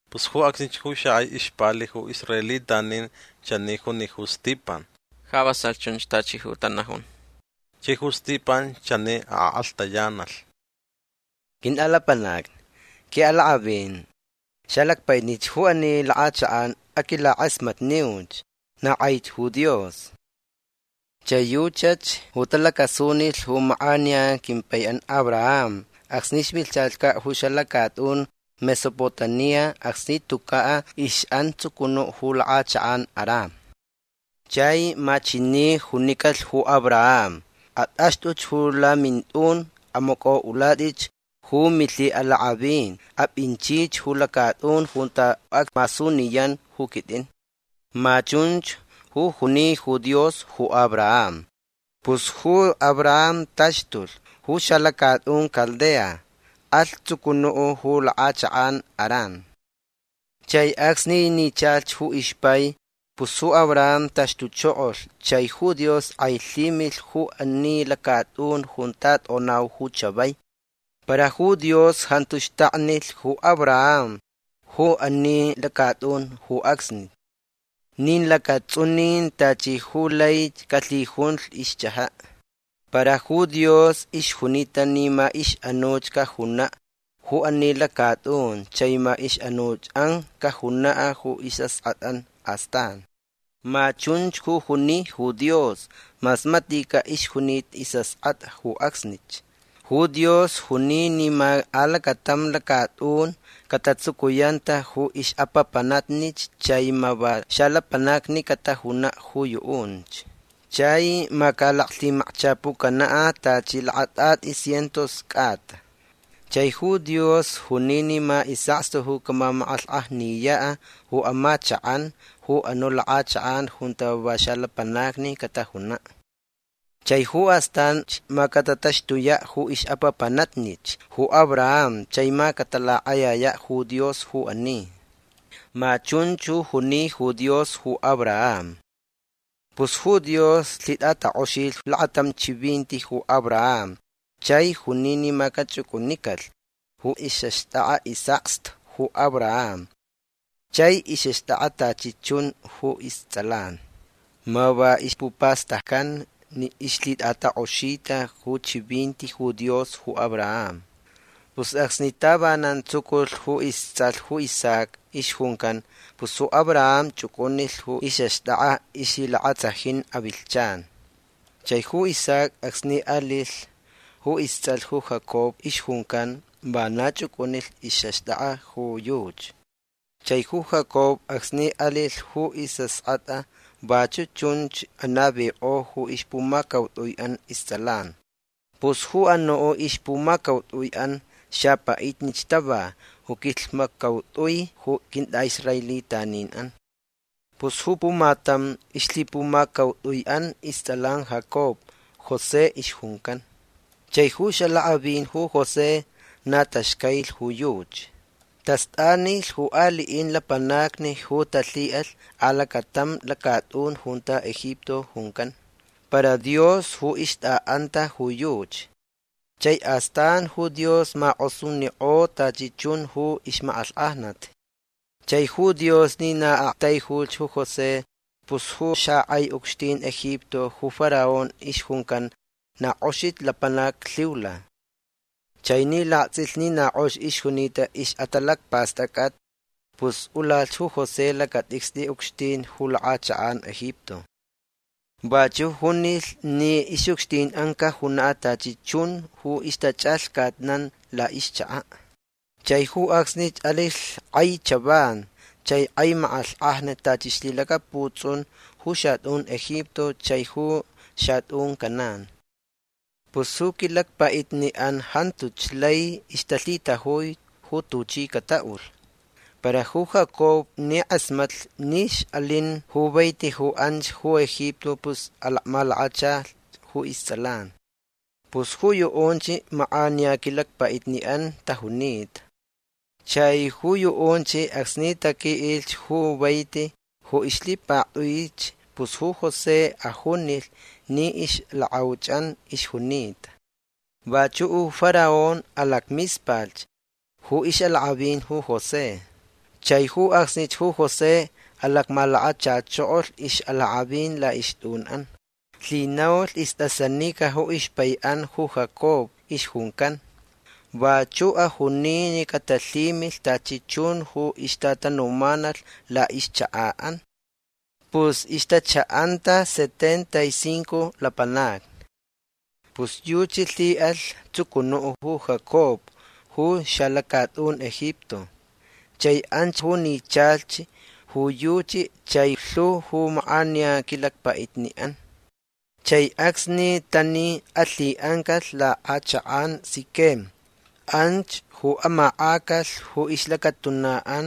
Pus ju acsnich ju xakʼai ixpali ju israelitanin chani juni ju Stipan: ―Ja vasalh chunch tachi ju tanajun. Chai ju Stipan chani akʼalhtayanalh: ―Quintʼalapanacni. Quiʼalakʼavin. Xalacpaʼitnich ju ani lakʼachakʼan. Aquilakʼasmatniuch. Na kʼaich ju Dios. Chai yuchach ju talacasunilh ju makʼaniya quimpaiʼan Abraham acsni ixvilhchacaʼ ju xalacatʼun Mesopotamia acsni tucaʼ ixʼan tsucunuʼ ju lakʼachakʼan Harán. Chai ma chani junicalh ju Abraham: “Atʼaxtʼuch ju lamintʼun. Amacʼoʼulatʼi ju milhiʼalakʼavin. Apʼinchich ju lacatʼun junta acmasuniyan ju quitʼin”. Ma chunch ju juni ju Dios ju Abraham. Pus ju Abraham taxtulh ju xalacatʼun Caldea. Alh tsucunuʼ ju lakʼachakʼan Harán. Chai acsni nichalh ju ixpai pus ju Abraham taxtuchokolh chai ju Dios kʼailhimilh ju ani lacatʼun junta tʼonau ju chavai. Para ju Dios jantu xtaknilh ju Abraham ju ani lacatʼun ju acsni. Nin lacatsʼunin tachi ju lai calhijunlh ixchʼajaʼ. Para ju Dios ixjunita ni ma ixʼanuʼ cajunaʼ ju ani lacatʼun chai ma ixʼanuchʼan cajunaʼ ju isʼaskʼatʼan astan. Ma chunch ju juni ju Dios mas maticaʼ ixjunita isʼaskʼatʼa ju acsnich. Ju Dios juni ni ma alacatam lacatʼun catatsucuyanta ju ixʼapapanatnich chai ma va xalapanacni catajunaʼ ju yuʼunch. Chai ma calaclhimakchapucanaʼ tachi lakatʼatʼi cientos cʼata. Chai ju Dios juni ni ma isʼakstu ju camamakʼalhkʼajniyaʼ ju amachakʼan ju anuʼ lakʼachakʼan junta va xalapanacni catajunaʼ. Chai ju astanch ma catataxtuyaʼ ju ixʼapapanatnich ju Abraham chai ma catalakʼayayaʼ ju Dios ju ani. Ma chunch ju juni ju Dios ju Abraham. Pus ju Dios lhitʼatakʼoxilh lakatam chivinti ju Abraham chai juni ni ma cachʼucʼunicalh ju ixʼaxtʼakʼa isʼakstu ju Abraham chai ixʼaxtʼakʼa tachi chun ju istsʼalan. Ma va ispupastaccan ni ixlhitʼatakʼoxita ju chivinti ju Dios ju Abraham. Pus acsni tavanan tsuculh ju istsʼalh ju Isaac ixjuncan pus ju Abraham chʼucʼunilh ju ixʼaxtʼakʼa ixlhilakatsajin avilhchan. Chai ju Isaac acsni alilh ju istsʼalh ju Jacob ixjuncan vana chʼucʼunilh ixʼaxtʼakʼa ju yuchi. Chai ju Jacob acsni alilh ju isʼaskʼatʼa vachuʼ chunch anavikʼo ju ixpumacautʼuiʼan istsʼalan. Pus ju anuʼ ixpumacautʼuiʼan xapaʼitnich tava ju quilhmaccautʼui ju quintʼaʼisraelitaninʼan. Pus ju pumatam ixlhipumacautʼuiʼan istsʼalan Jacob José ixjuncan. Chai ju ixʼalakʼavin ju José na taxcailich ju yuchi. Tastʼanilh ju aliʼin lapanacni ju talhiʼalh alacatam lacatʼun junta Egipto juncan. Para Dios ju ixtʼaʼanta ju yuchi. Chai astan ju Dios makʼosunikʼo tachi chun ju ixmakʼalhkʼajnat. Chai ju Dios ni na aktaijulh ju José pus ju xakʼai ucxtin Egipto ju Faraón ixjuncan na kʼoxich lapanac lhiula. Chai ni laktsʼilh ni na kʼox ixjunita ixʼatalacpastʼacʼat pus ulalh ju José lacatʼicstʼi ucxtin ju lakʼachakʼan Egipto. Vachuʼ junilh ni ixʼucxtinʼan cajunaʼ tachi chun ju ixtachʼalhcatnan laʼixchakaʼ. Chai ju acsnich alilh kʼai chavan chai kʼai makʼalhkʼajnat tachi ixlhilacaputsʼun ju xatʼun Egipto chai ju xatʼun Canaán. Pus ju quilacpaʼitniʼan jantuch lai ixtalhitajui ju tuchi cataʼulh. Para ju Jacob ni kʼasmatlh ni ixʼalin ju vaiti ju anch ju Egipto pus alacmalakachalh ju istsʼalan. Pus ju yuʼunch makʼaniya quilacpaʼitniʼan tajunita. Chai ju yuʼunch acsni taquiʼilh ju vaiti ju ixlhipaktʼuich pus ju José ajunilh ni ixlakʼauchʼan ixjunita. Vachuʼ ju Faraón alacmispalh ju ixʼalakʼavin ju José. Chai ju acsnich ju José alacmalakachachokolh ixʼalakʼavin laʼixtʼunʼan. Lhinaulh istʼasanica ju ixpaiʼan ju Jacob ixjuncan. Vachuʼ ajuni ni catalhimilh tachi chun ju ixtatanumanalh laʼixchakaʼan. Pus ixtachaʼanta setenta y cinco lapanacni. Pus yuchi lhiʼalh tsucunuʼ ju Jacob ju xalacatʼun Egipto. Chai anch ju nichalh ju yuchi chai lhu ju makʼaniya quilacpaʼitniʼan. Chai acsni tani alhiʼancalh lakʼachakʼan Siquem. Anch ju amakʼacalh ju ixlacatunaʼan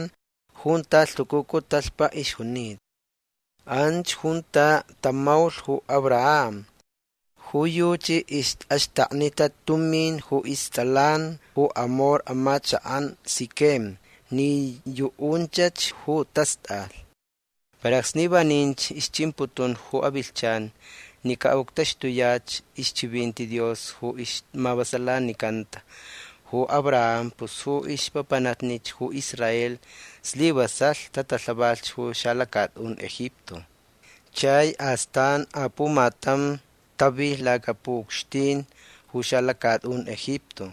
junta lhucucu talhpa ixjunita. Anch junta tamaulh ju Abraham. Ju yuchi ixʼaxtaknita tumin ju istsʼalan ju Hamor amachakʼan Siquem ni yuʼunchach ju tastʼalh. Para acsni vaninch ixchimputunch ju avilhchan ni caʼuctaxtuyach ixchivinti Dios ju ixmavasalanicanta ju Abraham pus ju ixʼapapanatnich ju Israel slivasalh tatalhavalhch ju xalacatʼun Egipto. Chai astan apumatam tavilh lacapuʼucxtin ju xalacatʼun Egipto.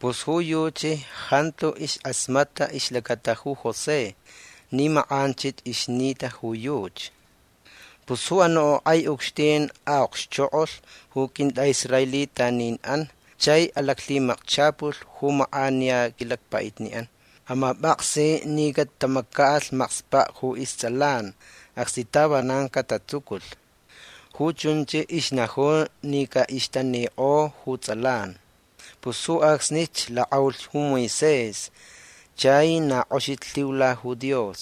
Pus ju yuchi jantu iskʼasmatʼa ixlacata ju José ni makʼanchich ixnita ju yuchi. Pus ju anuʼ kʼai ucxtin aʼokxchokʼolh ju quintʼaʼisraelitaninʼan chai alaclhimakchapulh ju makʼaniya quilacpaʼitniʼan. Amapʼaksi ni catamacaʼalh makspaʼ ju istsʼalan acsni tavanan catatsuculh. Ju chunch ixnajun ni caʼixtanikʼo ju tsʼalan. Pus ju acsnich lakʼaulh ju Moisés chai na kʼoxich lhiula ju Dios.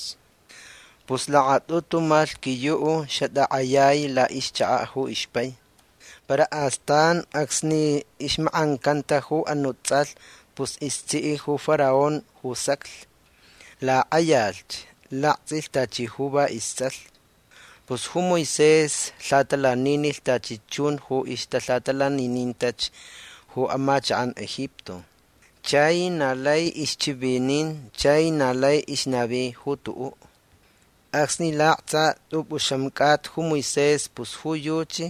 Pus lakatʼutu malhquiyuʼ xatakʼayai laʼixchakaʼ ju ixpai. Para astan acsni ixmakʼancanta ju anuʼ tsʼalh pus istsiʼ ju Faraón ju saclh. Lakʼayalhch. Laktsʼilh tachi ju va istsʼalh. Pus ju Moisés lhaʼatalaninilh tachi chun ju ixtalhaʼatalaninintach ju amachakʼan Egipto. Chai na lai ixchivinin chai na lai ixnavi ju tuʼuʼ. Acsni laktsa tʼupʼuxam cʼata ju Moisés pus ju yuchi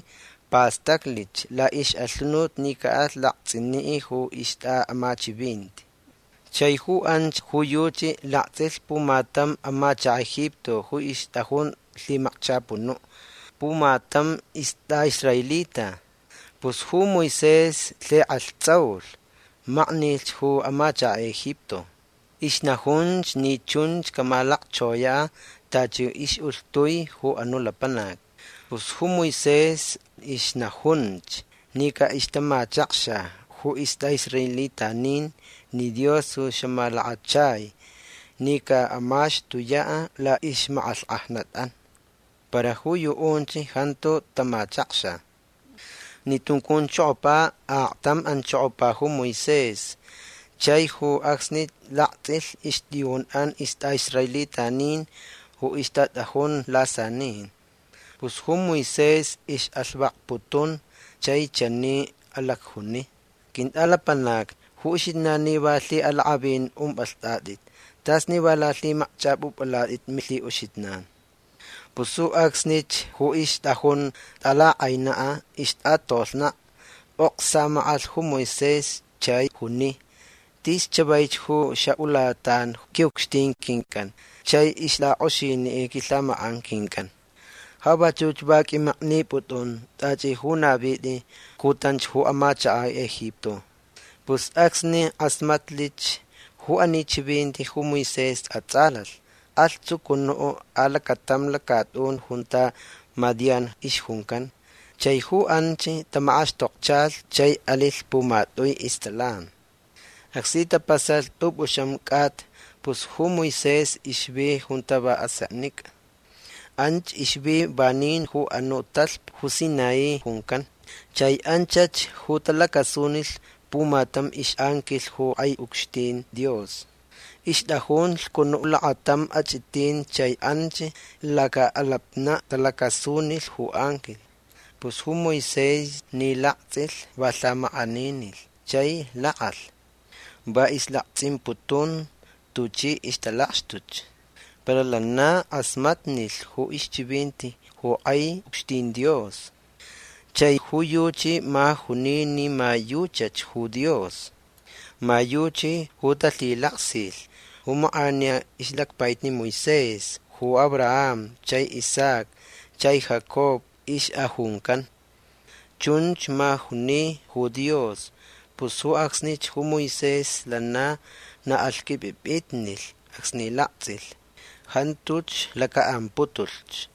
pastaclich laʼixʼalhunut ni caʼalh laktsʼiniʼ ju ixtʼaʼamachivinti. Chai ju anch ju yuchi laktsʼilh pumatam amachakaʼ Egipto ju ixtʼajun lhimakchapunuʼ pumatam istʼaʼisraelita. Pus ju Moisés lhikʼalhtsaulh. Maknilh ju amachakaʼ Egipto. Ixnajunch ni chunch camalacchoyaʼ tachi ixʼulhtui ju anuʼ lapanac. Pus ju Moisés ixnajunch ni caʼixtamachakxa ju istʼaʼisraelitanin ni Dios ju xamalakachai ni caʼamaxtuyaʼ laʼixmakʼalhkʼajnatʼan. Para ju yuʼunch jantu tamachakxa. Ni tuncunchokopa aktam anchokopa ju Moisés chai ju acsnich laktsʼilh ixtʼiyunʼan istʼaʼisraelitanin ju ixtatʼajun lasanin. Pus ju Moisés ixʼalhvakputun chai chani alacjuni: “Quintʼalapanacni ju uxijnan ni va lhiʼalakʼavin umpʼalhtʼatʼit. Tas ni va lalhimakchʼapʼupʼalatʼit milhiʼuxijnan”. Pus ju acsnich ju ixtʼajun tʼalakʼainaʼ ixtʼatolhnaʼ pʼok samakʼalh ju Moisés chai juni: “Tis chavaich ju xaʼulatan quiʼucxtin quincʼan chai ixlakʼoxiniʼ quilhamakʼan quincʼan. Ja vachuch va qʼuimaknipʼutʼun tachi ju navitʼi cutanch ju amachakaʼ Egipto”. Pus acsni kʼasmatlich ju ani chivinti ju Moisés atsʼalalh. Alh tsucunuʼ alacatam lacatʼun junta Madián ixjuncan. Chai ju anch tamakʼaxtokchalhch chai alilh pumatʼui istsʼalan. Acsni tapasalh tʼupʼuxam cʼata pus ju Moisés ixvi junta va aseknicʼa. Anch ixvi vanin ju anuʼ talhpa ju Sinaí juncan. Chai anchach ju talacasunilh pumatam ixʼanquilh ju kʼai ucxtin Dios. Ixtʼajun lhcunuʼ lakatam achʼitin chai anch lacaʼalapnaʼ talacasunilh ju anquilh. Pus ju Moisés ni laktsʼilh va lhamakʼaninilh chai lakʼalh. Va islaktsʼimputun tuchi ixtalakxtuch. Para lana kʼasmatnilh ju ixchivinti ju kʼai ucxtin Dios. Chai ju yuchi ma juni ni ma yuchach ju Dios. Ma yuchi ju talhilaksilh ju makʼaniya ixlacpaʼitni Moisés ju Abraham chai Isaac chai Jacob ixʼajuncan. Chunch ma juni ju Dios. Pus ju acsnich ju Moisés lana na alhqʼuipʼipʼitnilh acsni laktsʼilh. Jantuch lacaʼamputulhch.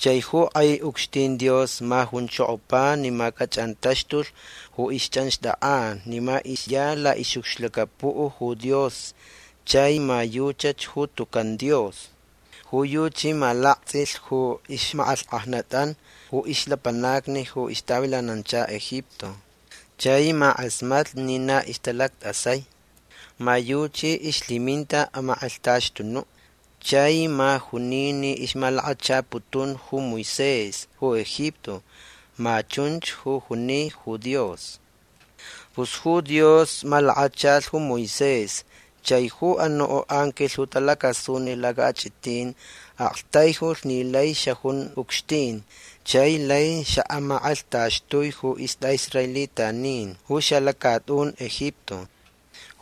Chai ju kʼai ucxtin Dios ma junchokopa ni ma cachʼanmaxtulh ju ixchʼanxtʼakʼan ni ma ixya laʼixʼucxlacapuʼ ju Dios chai ma yuchach ju tucan Dios. Ju yuchi ma laktsʼilh ju ixmakʼalhkʼajnat ju ixlapanacni ju ixtavilanancha Egipto. Chai ma kʼasmatlh ni na ixtalactʼasai. Ma yuchi ixlhiminta amakʼalhtaxtunuʼ. Chai ma juni ni ixmalakachaputun ju Moisés ju Egipto. Ma chunch ju juni ju Dios. Pus ju Dios malakachalh ju Moisés chai ju anuʼ anquilh ju talacasunilh lacaʼachʼitin aktaijulh ni lai xajun ucxtin chai lai xaʼamakʼalhtaxtui ju istʼaʼisraelitanin ju xalacatʼun Egipto.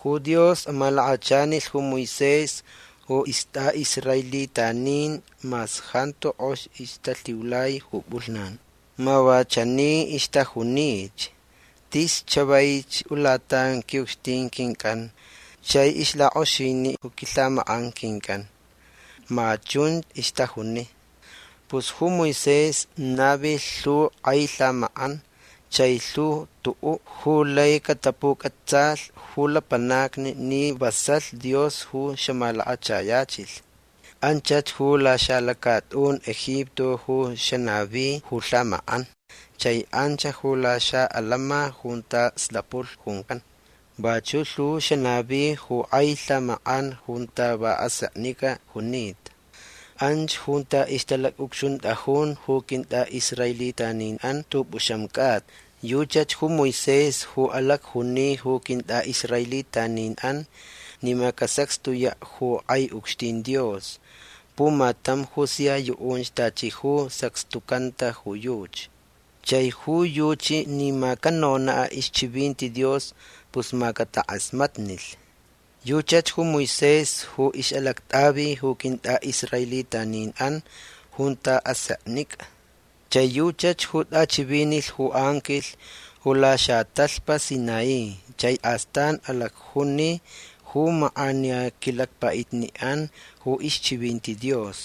Ju Dios amalakachanilh ju Moisés ju istʼaʼisraelitanin mas jantu kʼox ixtalhiulai ju pʼulhnan. Ma va chani ixtajunich: “Tis chavaich ulatan quiʼucxtin quincʼan chai ixlakʼoxiniʼ ju quilhamakʼan quincʼan”. Ma chun ixtajuni. Pus ju Moisés navilh lhu kʼai lhamakʼan chai lhu tuʼuʼ ju lai catapucʼatsalh ju lapanacni ni vasalh Dios ju xamalakachayachilh. Anchach ju laxalacatʼun Egipto ju xanavi ju lhamakʼan chai anch ju laxaʼalama junta slapulh juncan. Vachuʼ lhu xanavi ju kʼai lhamakʼan junta va aseknicʼa junita. Anch junta ixtalacʼucxuntʼajun ju quintʼaʼisraelitaninʼan tʼupʼuxam cʼata. Yuchach ju Moisés ju alacjuni ju quintʼaʼisraelitaninʼan ni ma casacxtuyaʼ ju kʼai ucxtin Dios pumatam ju sia yuʼunch tachi ju sacxtucanta ju yuchi. Chai ju yuchi ni ma canonaʼ ixchivinti Dios pus ma catakʼasmatnilh. Yuchach ju Moisés ju ixʼalactʼavi ju quintʼaʼisraelitaninʼan junta aseknicʼa. Chai yuchach ju tʼachivinilh ju anquilh ju laxatalhpa Sinaí chai astan alacjuni ju makʼaniya quilacpaʼitniʼan ju ixchivinti Dios.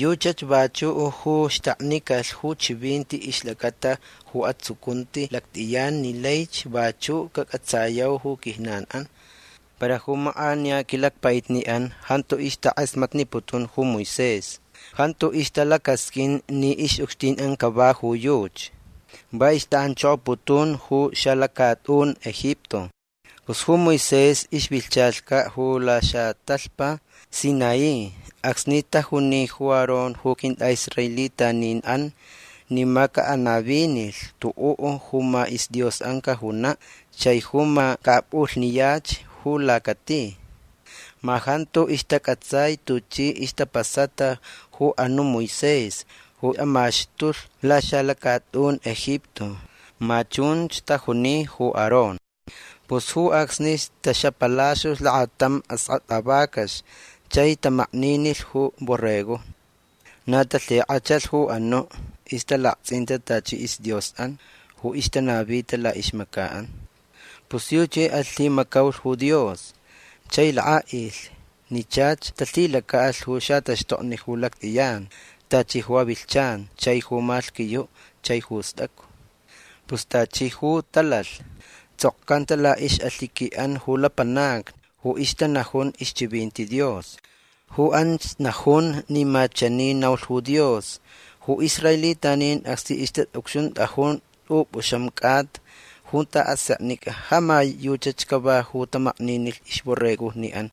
Yuchach vachuʼ ju xtaknicalh ju chivinti ixlacata ju atsucunti lactʼiyan ni laich vachuʼ cacʼatsayau ju quijnanʼan. Para ju makʼaniya quilacpaʼitniʼan jantu ixtakʼasmatniputun ju Moisés. Jantu ixtalacasqʼuin ni ixʼucxtinʼan cava ju yuchi. Va ixtaʼanchokoputun ju xalacatʼun Egipto. Pus ju Moisés ixvilhchacaʼ ju laxatalhpa Sinaí acsni tajuni ju Aarón ju quintʼaʼisraelitaninʼan ni ma caʼanavinilh tuʼuʼ ju ma isdiosʼan cajunaʼ chai ju ma caʼapʼulhniyach ju lacati. Ma jantu ixtacʼatsai tuchi ixtapasata ju anuʼ Moisés ju amaxtulh laxalacatʼun Egipto. Ma chunch tajuni ju Aarón. Pus ju acsnich taxapalaxtulh lakatam askʼatʼa vacax chai tamakninilh ju borregojni. Na talhikʼachalh ju anuʼ ixtalaktsʼinta tachi isdiosʼan ju ixtanavita laʼixmacaʼan. Pus yuchi alhimacaulh ju Dios chai lakʼaʼilh ni chach talhilacaʼalh ju xataxtokni ju lactʼiyan tachi ju avilhchan chai ju malhquiyuʼ chai ju stʼacu. Pus tachi ju talalh tsʼokcanta laʼixʼalhiquiʼan ju lapanacni ju ixtanajun ixchivinti Dios. Ju anch najun ni ma chani naulh ju Dios: Ju israelitanin acsni ixtaʼucxuntʼajun tʼupʼuxam cʼata junta aseknicʼa ja ma yuchach cava ju tamakninilh ixborregojniʼan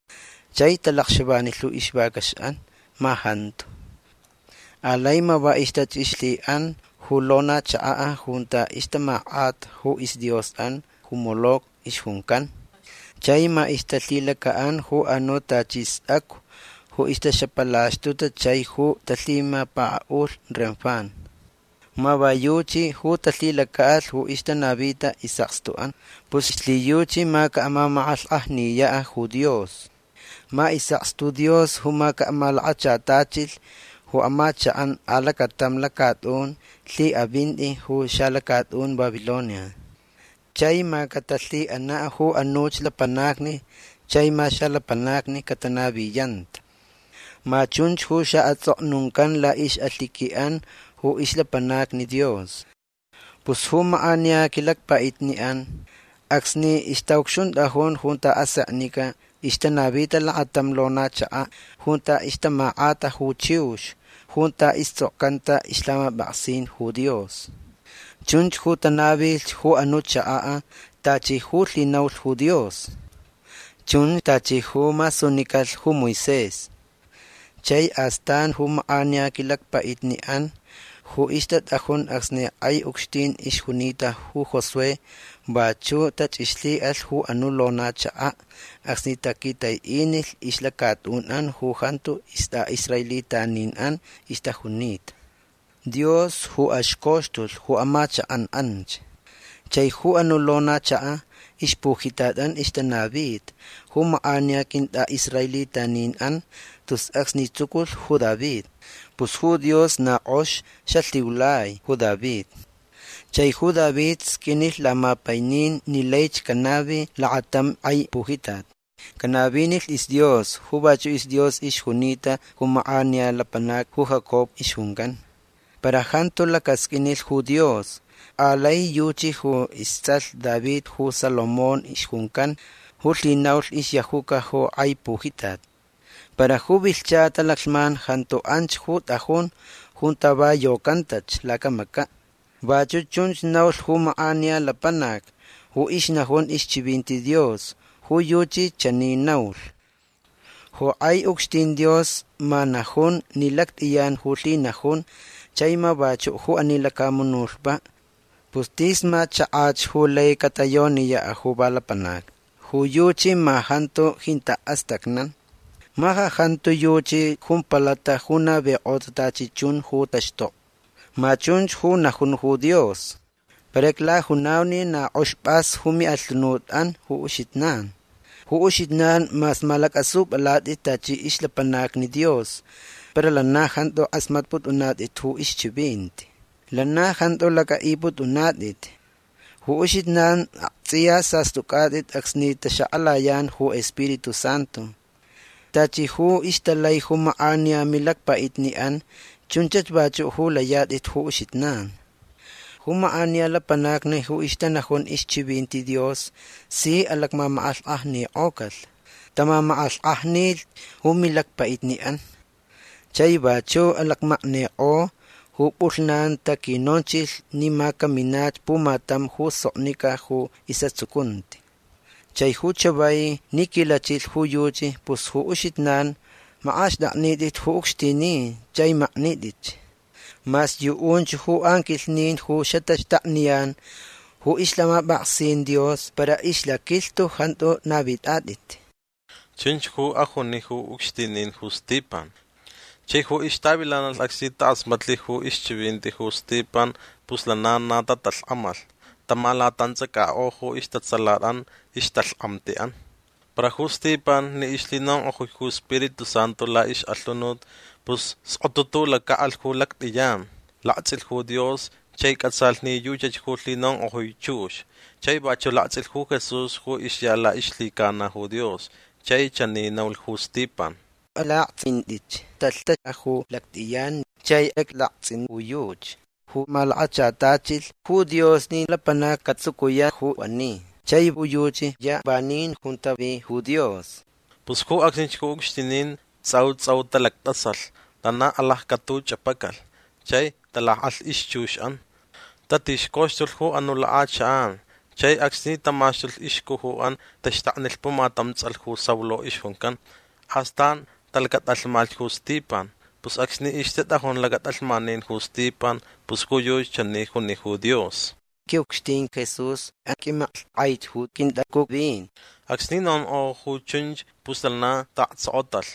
chai talakxavanilh ju ixvacaxʼan. Ma jantu. Alai ma va ixtachʼixlhiʼan ju lona chakaʼ junta ixtamakʼata ju isdiosʼan ju Moloc ixjuncan. Chai ma ixtalhilacaʼan ju anuʼ tachi stʼacu ju ixtaxapalaxtuta chai ju talhimapakaʼulh Renfán. Ma va yuchi ju talhilacaʼalh ju ixtanavita isʼakstuʼan. Pus ixlhiyuchi ma camamakʼalhkʼajniyaʼ ju Dios. Ma isʼakstu Dios ju ma caʼamalakachatachilh ju amachakʼan alacatam lacatʼun lhiʼavinti ju xalacatʼun Babilonia. Chai ma catalhiʼanaʼ ju anuch lapanacni chai ma xalapanacni catanaviyanta. Ma chunch ju xaʼatsʼoknuncan laʼixʼalhiquiʼan ju ixlapanacni Dios. Pus ju makʼaniya quilacpaʼitniʼan acsni ixtaʼucxuntʼajun junta aseknicʼa ixtanavita lakatam lona chakaʼ junta ixtamakʼata ju chiux junta istsʼokcanta ixlhamapʼaksin ju Dios. Chunch ju tanavilh ju anuʼ chakaʼ tachi ju lhinaulh ju Dios. Chun tachi ju masunicalh ju Moisés. Chai astan ju makʼaniya quilacpaʼitniʼan ju ixtatʼajun acsni kʼai ucxtin ixjunita ju Josué vachuʼ tachʼixlhiʼalh ju anuʼ lona chakaʼ acsni taquitaiʼinilh ixlacatʼunʼan ju jantu istʼaʼisraelitaninʼan ixtajunita. Dios ju axcoxtulh ju amachakʼan anch. Chai ju anuʼ lona chakaʼ ixpujitatʼan ixtanavita ju makʼaniya quintʼaʼisraelitaninʼan tus acsni tsuculh ju David. Pus ju Dios na kʼox xalhiulai ju David chai ju David sqʼuinilh lamapainin ni laich canavi lakatam kʼai pujitat. Canavinilh isDios ju vachuʼ isDios ixjunita ju makʼaniya lapanac ju Jacob ixjuncan. Para jantu lacasqʼuinilh ju Dios. Alai yuchi ju istsʼalh David ju Salomón ixjuncan ju lhinaulh ixyajuca ju kʼai pujitat. Para ju vilhcha talaclhman jantu anch ju tʼajun junta va yocantach lacamacaʼ. Vachuʼ chunch naulh ju makʼaniya lapanac ju ixnajun ixchivinti Dios. Ju yuchi chani naulh: Ju kʼai ucxtin Dios ma najun ni lactʼiyan ju lhinajun chai ma vachuʼ ju ani lacamunutpaʼ. Pus tis ma chakach ju lai catayoniyaʼ ju va lapanacni. Ju yuchi ma jantu jintaʼ astacnan. Ma ja jantu yuchi jumpalata ju navikʼota tachi chun ju taxtokni. Ma chunch ju najun ju Dios. Para iclajunau ni na kʼox pʼas ju miʼalhunutʼan ju uxijnan. Ju uxijnan mas malacʼasupʼalatʼit tachi ixlapanacni Dios para lana jantu kʼasmatpʼutʼunatʼit ju ixchivinti. Lana jantu lacʼaʼipʼutʼunatʼit. Ju uxijnan aktsʼiya sastʼucʼatʼit acsni taxakʼalayan ju Spiritu Santu. Tachi ju ixtalai ju makʼaniya milacpaʼitniʼan chunchach vachuʼ ju layatʼit ju uxijnan. Ju makʼaniya lapanacni ju ixtanajun ixchivinti Dios si alacmamakʼalhkʼajnikʼocalh. Tamamakʼalhkʼajnilh ju milacpaʼitniʼan. Chai vachuʼ alacmaknikʼo ju pʼulhnan taquinonchilh ni ma caminach pumatam ju soknicʼa ju isʼatsucunti. Chai ju chavai ni quilachilh ju yuchi pus ju uxijnan makʼaxtʼaknitʼit ju ucxtinin chai maknitʼitch. Mas yuʼunch ju anquilhnin ju xataxtakniyan ju ixlhamapʼaksin Dios para ixlaquilhtu jantu navitʼatʼit. ―Chunch ju ajuni ju ucxtinin ju Stipan. Chai ju ixtavilanalh acsni takʼasmatlh ju ixchivinti ju Stipan pus lana na tatalhkʼamalh. Tamalatantsʼacakʼo ju istatsalatʼan ixtalhkʼamtiʼan. Para ju Stipan ni ixlhinonkʼojui ju Spiritu Santu laʼixʼalhunut pus skotutulacaʼalh ju lactʼiyan. Laktsʼilh ju Dios chai cʼatsalh ni yuchach ju lhinonkʼojui chux. Chai vachuʼ laktsʼilh ju Jesús ju ixya laʼixlhicana ju Dios. Chai chani naulh ju Stipan: ―Alaktsʼintʼitch. Talhtekʼa ju lactʼiyan chai iclaktsʼin ju yuchi ju malakachatachilh ju Dios ni lapanac catsucuyaʼ ju ani. Chai ju yuchi ya vanin junta vi ju Dios. Pus ju acsnich ju ucxtinin tsʼau tsʼau talactʼasalh. Lana alaccʼatuchʼapacalh. Chai talakʼalh ixchuxʼan. Tatixcauxtulh ju anuʼ lakʼachakʼan. Chai acsni tamaxtulh ixcujuʼan taxtaknilh pumatam tsʼalh ju Saulo ixjuncan. Astan talacatʼalhmalhch ju Stipan. Pus acsni ixtatʼajun lacatʼalhmanin ju Stipan pus ju yuchi chani juni ju Dios: ―Quiʼucxtin Jesús aqʼuimaklhtʼaich ju quintacuvin. Acsni nonkʼo ju chunch pus lana taʼaktsokotalh.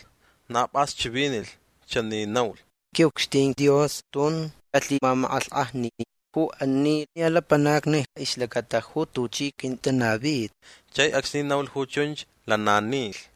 Na pʼas chivinilh. Chani naulh: ―Quiʼucxtin Dios tun alhimamakʼalhkʼajnitʼi ju ani ya lapanacni ixlacata ju tuchi quintanavi. Chai acsni naulh ju chunch lana nilh.